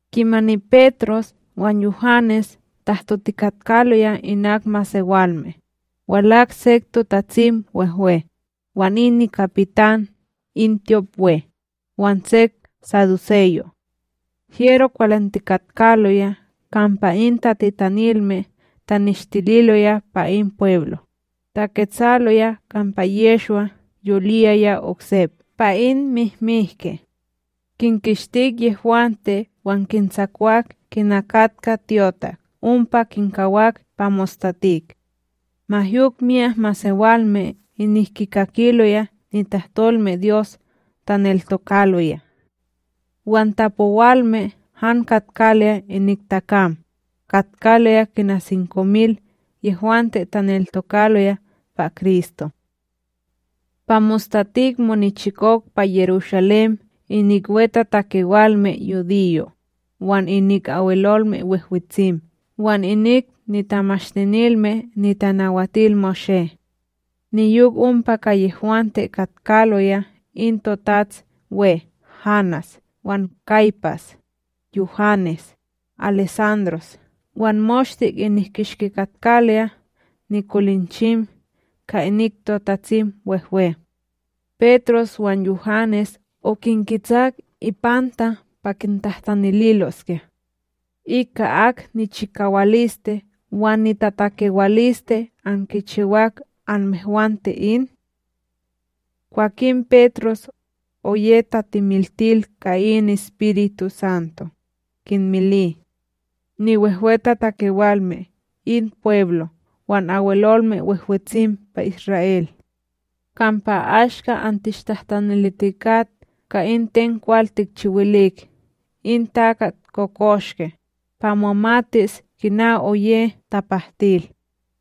Kimani Petros wan Yuhanes tahtotikatkaloya inak in masewalme, walak sek TotatsimWehwe, wan in nikapitan in tyopWe wan sek saduseyo'. Hyero kwalantikatkaloya kampa in tatitanilme taneshtililoya pa in pweblo, taketsaloya kampa Yehshwa yoliyaya oksep pa in mihmihke. Kinkitskik yehwante wan kintsakwak kina katka tyotak ompa kinkawak pa mostatik. Ma yok myak masewalme inik kikakiloya nitahtolmeDyos taneltokaloya; wan tapowalme han katkaloya inik takam, katkaloya kina makwil mil yehwante taneltokaloya pa Kristo. Pa mostatik monichikok pa Yerushalém inik niwetatakewalme yudiyo', wan inik Abwelolme Wehwetsim wan inik niTamashtinilme NitanawatilMoshé; niyok ompa ka yehwante katkaloya in toTatsWe Hanás wan Kaypas, Yuhanes, Alesandros wan moshte inik kishki katkaloya nikolinchim ka inik TotatsimWehwe. Petros wan Yuhanes okinketsak ipanta pa kintahtanililoskya: —Ika ak nichikawaliste wan nitatakewaliste ankichiwak anmehwante in? Kwakin Petros, oye tatimiltil ka in EspirituSanto, kinmili: —Niwehwetatakewalme in pweblo wan Abwelolme Wehwetsim pa Isra'el: kampa ashka antishtahtanilitikat ka in ten kwal tikchiwilik in takat kokoshke, pa momatis kina oye tapahtil,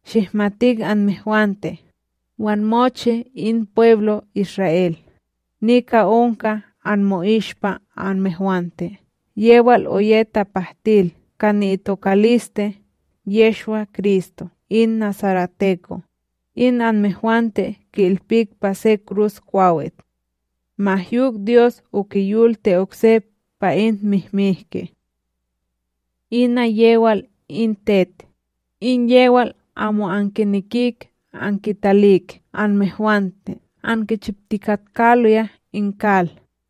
Shihmatik anmehwante, wan mochi in pweblo Isra'El, nika onka anmo'ishpa anmehwante yewal oye tapahtil ka ni'itokaliste Yehshwa-Kristo in nasareteko, in anmehwante ki'ilpik pa se Kruskwawit. Ma yok, Dyos okiyolti oksep pa in mihmihke. Ina yewal in tet, in yewal amo ankinekik ankitalik anmehwante ankichiptikatkaloya in kal,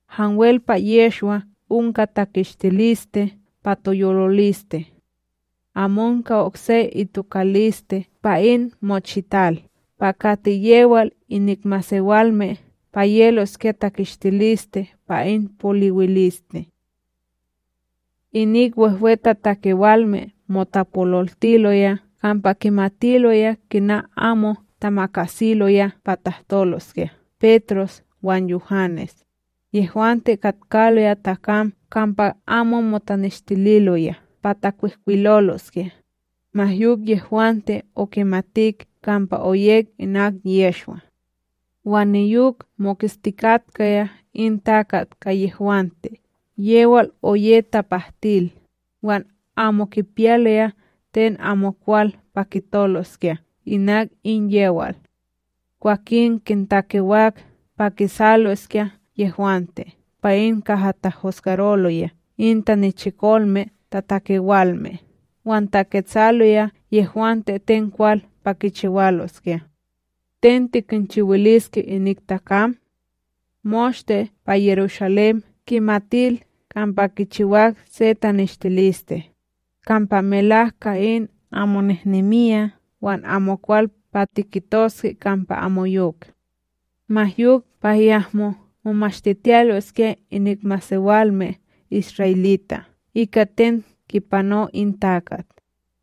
Hanwel pa Yehshwa onka takistiliste pa toyoliliste. Amonka okse itokaliste pa in mochital pa kati yewal inik masewalme pa yeloskya takistiliste pa in poliwiliste. Inik wehwetatakewalme motapololtiloya kampa kinmitaloya kina amo tamakasiloya pa tahtoloskya Petros wan Yuhanes, yehwante katkaloya takam kampa amo motaneshtililoya pa takwihkwiloloskya, ma yok yehwante okimatik kampa oyek inak Yehshwa. Wan niyok moketstikatkaya in takat ka yehwante yewal oye tapahtil, wan amo kipiyaloya ten amokwal pa kitoloskya inak in yewal. Kwakin kintakewak pa kisaloskya yehwante pa in kaha tahosgaroloya in tanichikolme tatakewalme wan taketsaloya yehwante ten kwal pa kichiwaloskya. —Ten tikinchiwiliske inik takam? Moshte pa Yerushalém kimatil kampa kichiwak se taneshtiliste, kampa melak ka in amo nehnemiya wan amokwal pa tikitoske kampa amoyok. Ma yok pa yahmo momashtitiyaloskya inik masewalme isra'elita' ika ten kipano in takat,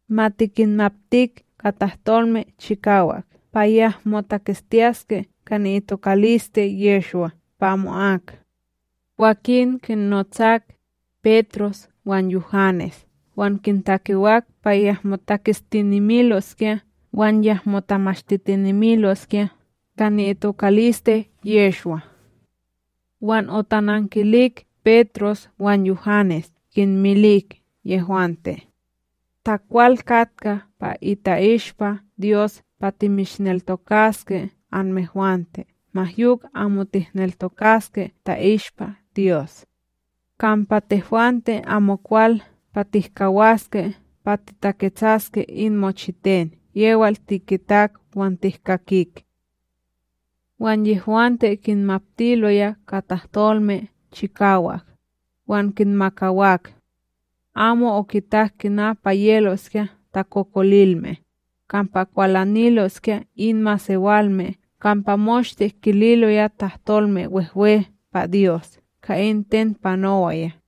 ma tikinmaptik ka tahtolme chikawak pa yahmo taketstiyaske ka ni'itokaliste Yehshwa pa amo'ak. Kwakin kinnotsak, Petros wan Yuhanes wan kintakewak pa yahmo taketstinemiloskya wan yahmo tamashtitinemiloskya ka ni'itokaliste Yehshwa. Wan otanankilik Petros wan Yuhanes kinmilik yehwante: —Ta kwal katka pa ni'ishpa Dyos pa timishneltokaske anmehwante ma yok amo tihneltokaske ta'ishpa Dyos. Kampa tehwante amokwal pa tihkawaske pa titaketsaske in mochiten yewal tikitak wan tihkakik. Wan yehwante kinmaptiloya ka tahtolme chikawak, wan kinmakawak. Amo okitak kina pa yeloskya takokolilme, kampa kwalaniloskya in masewalme kampa moshte kililoya tahtolme wehwe pa Dyos ka in ten panowaya.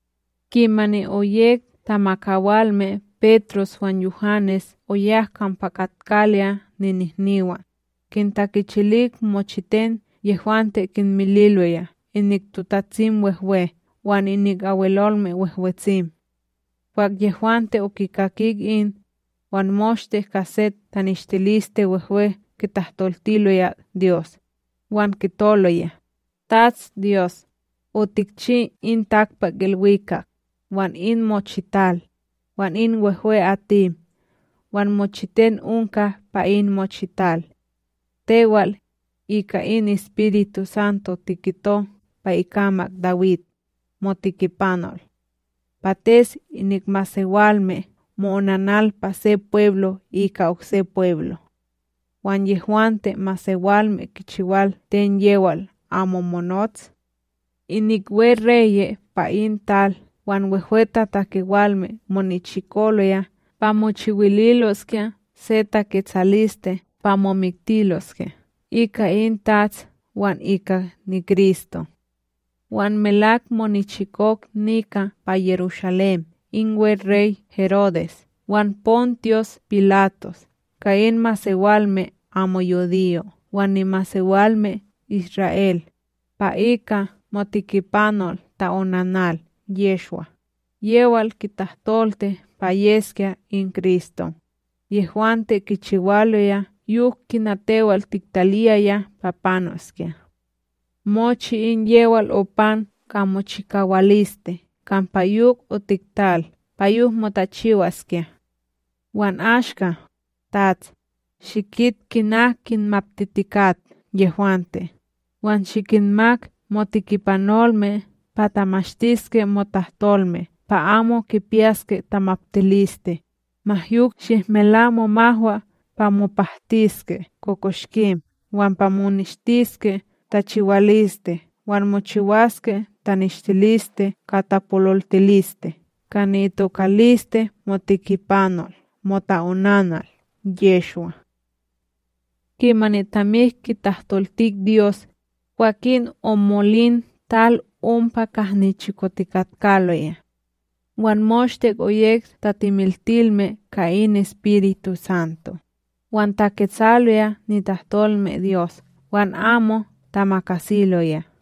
Kimani oyek tamakawalme Petros wan Yuhanes oyak kampa katkaloya ninihniwan, kintakichilik mochiten yehwante kinmililoya inik TotatsimWehwe wan inik Abwelolme Wehwetsim. Kwah yehwante okikakik in, wan moshte ka se tahtaniliste wehwe kitahtoltiloya Dyos, wan kitoloya: —TatsDyos, otikchi in takpakIlwikak, wan in mochital, wan in wehwe'atim wan mochiten onka pa in mochital. Tewal, ika in EspirituSanto tikito pa ikamak Dawid, motekipanol: Pates inik masewalme mo'onanal pa se pweblo' ika okse pweblo', wan yehwante masewalme kichiwal ten yewal amo monots? Inik weReye' pa in tal, wan wehwetatakewalme monichikoloya pa mochiwililoskya se taketsaliste pa momiktiloskya ika in TATS wan ika niKristo. ’Wan melak monichikok nika pa Yerushalém in weRey Herodes wan Pontyus Pilatos ka in masewalme amo yudiyo' wan nimasewalme Isra'El, pa ika moTikipanol ta'onanal Yehshwa, yewal tiktahtolti pa yeskya in Kristo. Yehwante kichiwaloya yok kina tewal tiktaliyaya pa panoskya; mochi in yewal opan ka mochikawaliste kampa yok otiktal pa yok motachiwaskya. Wan ashka, TATS, shikit kina kinmaptitikat yehwante, wan shikinmak motekipanolme pa tamashtiske motahtolme pa amo kipiyaske tamaptiliste, ma yok, shihmela momahwa pa mopahtiske kokoshkim wan pa moneshtiske tachiwaliste wan mochiwaske taneshtiliste ka tapololtiliste ka ni'itokaliste moTikipanol mota'onanal Yehshwa. Kimani tamik kitahtoltik Dyos, kwakin omolin tal ompa kaha nichikotikatkaloya; wan moshte oyek tatimiltilme ka in EspirituSanto, wan taketsaloya nitahtolmeDyos wan amo tamakasiloya.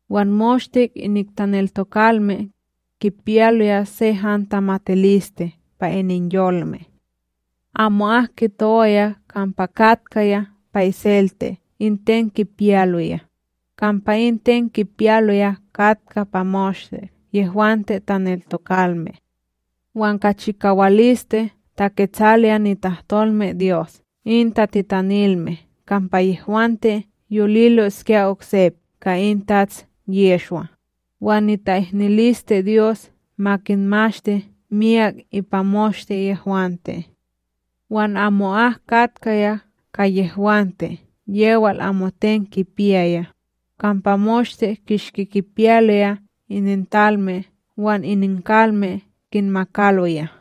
Wan moshte inik taneltokalme, kipiyaloya se han tamatiliste pa ininyolme. Amo'ak kitowaya kampa katkaya pa iselte in ten kipiyaloya, kampa in ten kipiyaloya katka pa moshte yehwante taneltokalme. Wan ka chikawaliste taketsaloya nitahtolmeDyos in tatitanilme kampa yehwante yoliloskya oksep ka in Tats Yehshwa, wan nita'ihniliste Dyos ma kinmashti miyak ipa moshte yehwante. Wan amo'ak katkaya ka yehwante yewal amoten kipiyaya, kampa moshte kishki kinpiyaloya inintalme wan ininkalme kinnamakaloya,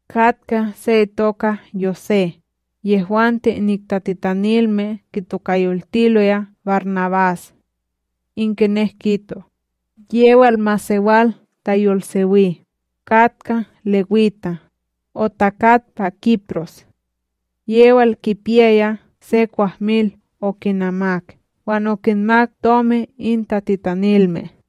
Katkaya se itoka Yosé, yehwante inik tatitanilme kitokayoltiloya BarNabás, in kinek kito, yewal masewal tayolsewi, katka lewita, otakat pa Kipros; yewal kipiyaya se kwahmil okinamak wan okinmak tomi in tatitanilme.